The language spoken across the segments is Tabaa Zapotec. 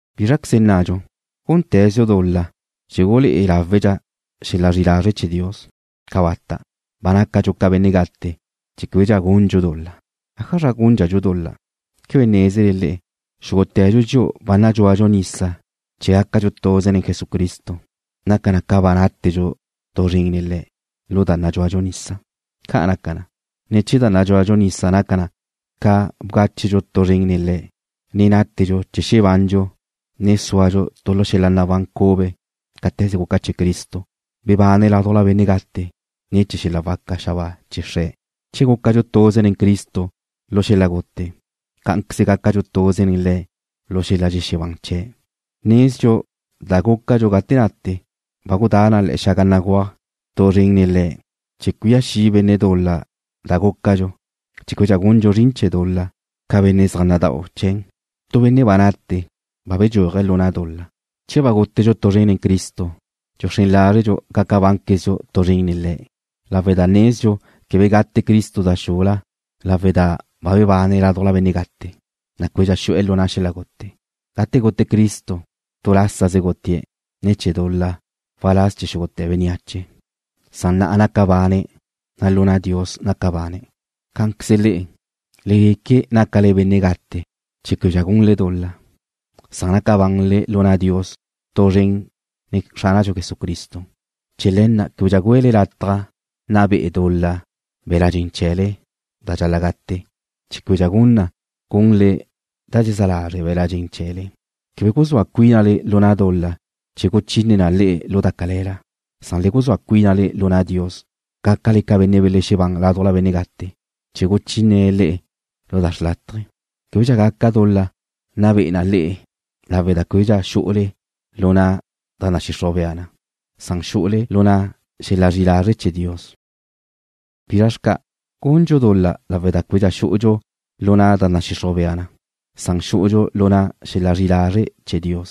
¿Bízraqueze nnadxu? ¿Gúndxadxu dul-la chee̱ gulé'e láwedxa xel-la zri'i lazre' chee̱ Dios? ¡Cabata'! Ba nácadxu ca benne' gate chee̱ québedxa gundxu dul-la. ¿Ájazra gúndxadxu dul-la? ¿Quebe nézele le'e, xúgute̱dxu dxi'u ba nadxúadxu nisa chee̱ gácadxu tuze nen Jesucristo, naca na ca ba nátedxu tu zren nen Le̱' lu da nadxúadxu nisa? Ca' naca na, ne̱ chee̱ da nadxúadxu nisa naca ca bgáchedxu tu zren nen Le̱', ne nátedxu chee̱ xebandxu, ne súadxu tu lu xel-la nabán cube cáte̱ze guca chee̱ Cristo, bebane̱' ládujla benne' gate ne̱ chee̱ xel-la waca xabáa chee̱ Xre̱'. Che gúcadxu tuze nen Cristo lu xel-la gute, cá'anqueze gácadxu tuze nen Le̱' lu xel-la dxexebán chee̱'. Nezdxu da gúcadxu gate nate ba gudá na le̱'e̱ xaga béguaj tu zren nen Le̱' chee̱ cuía xi' benne' dul-la da gúcadxu chee̱ québedxa gundxu zrin chee̱ dul-la ca benne' zaj nada'u chee̱n. Tu benne' ba nate, ba bedxúaje̱' lu na' dul-la. Che ba gútedxu tu zren nen Cristo, dxuxrén lázredxu gaca bánquezdxu tu zren nen Le̱' lawe' da nezdxu quebe gate Cristo da xula lawe' da ba bebane̱' ládujla benne' gate, na' québedxa xu'e̱ lu na' xel-la gute. Gate gute Cristo, tu lásaze gutie̱' ne̱ chee̱ dul-la waláz chee̱ xúgute̱ bénneache, san na'a naca bane̱', na' lu na' Dios naca bane̱'. Cá'anqueze le'e, le gueque nácale benne' gate chee̱ québedxa gunle dul-la, san naca banle lu na' Dios tu zren nen Xránadxu Jesucristo. Chee̱ le̱ na' québedxa güele lataj nna be'e dul-la be̱la' dxen chee̱le da dxal-la' gate, chee̱ québedxa gun na gunle da dxezá lazre' be̱la' dxen chee̱le. Quebe guzúa cuínale lu na' dul-la chee̱ guchine na le'e lu da cale̱la, san le guzúa cuínale lu na' Dios, gácale ca benne' belexebán ládujla benne' gate, chee̱ guchínene̱' le'e lu da xrlátaje. Québedxa gaca dul-la nna be'e na le'e lawe' da québedxa xu'ule lu na' da nadxixruj bea na, san xu'ule lu na' xel-la zri'i lazre' chee̱ Dios. ¿Bizra xca'? ¿Gundxu dul-la lawe' da québedxa xú'udxu lu na' da nadxixruj bea na, san xú'udxu lu na' xel-la zri'i lazre' chee̱ Dios?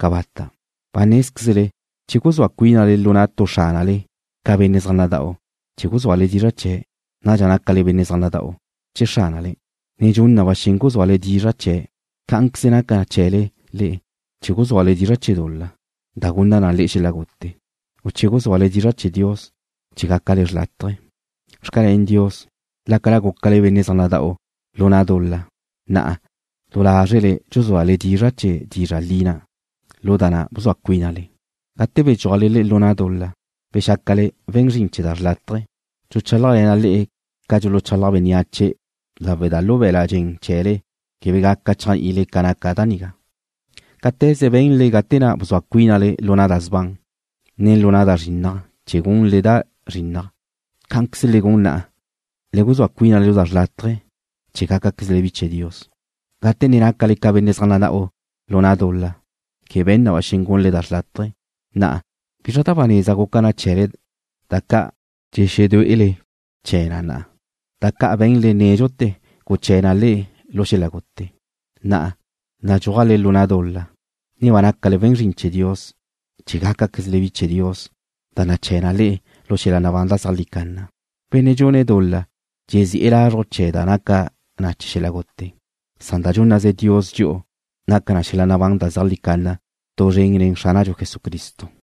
¡Cabata'! Ba nézquezle che guzúa cuínale lu na' tu xránale ca benne' zaj nada'u chee̱ guzúale dizra' chee̱', nadxa nácale benne' zaj nada'u chee̱ xránale, ne dxun na ba xen guzúale dizra' chee̱'. Cá'anqueze naca chee̱le le'e che guzúale dizra' chee̱ dul-la, da gunna na le'e xel-la gute, u che guzúale dizra' chee̱ Dios, chee̱ gácale xrlátaje. Xcalén Dios, lácala gúcale ca benne' zaj nada'u lu na' dul-la, na'a du lázrele dxuzúale dizra' chee̱ dizra' li na', lu da na' bzua cuínale. Gate bedxúajle le'e lu na' dul-la, bexácale we̱n zrin chee̱ da xrlátaje. (Dxuchálajle̱na' le'e ca dxuluchalaj bénneache lawe' da lu be̱la' dxen chee̱le quebe gaca chéajni'ile ca naca da nigá.) Cáte̱ze be̱nle gate na' bzua cuínale lu na' da sban, ne lu na' da zrinnaj chee̱ gunle da zrinnaj, cá'anqueze le gun na'a, le guzúa cuínale lu na' da xrlátaje chee̱ gácaquezle bi chee̱ Dios. Gate ne nácale ca benne' zaj nada'u lu na' dul-la, quebe be̱n na ba xen gunle da xrlátaje. Na'a ¿bizra da ba neza guca chee̱le da ca' dxexedué'ele chee̱n na'a? Da ca' be̱nle nédxute̱ guché̱ na le'e lu xel-la gute. Na'a nadxúajle lu na' dul-la, ne ba nácale we̱n zrin chee̱ Dios chee̱ gácaquezle bi chee̱ Dios da naché̱ na le'e lu xel-la nabán da zeajlí canna. Benne' dxune̱' dul-la dzezi'e̱ lazruj chee̱' da naca na xel-la gute, san da dxúnnaze Dios dxi'u naca na xel-la nabán da zeajlí canna tu zren nen Xránadxu Jesucristo.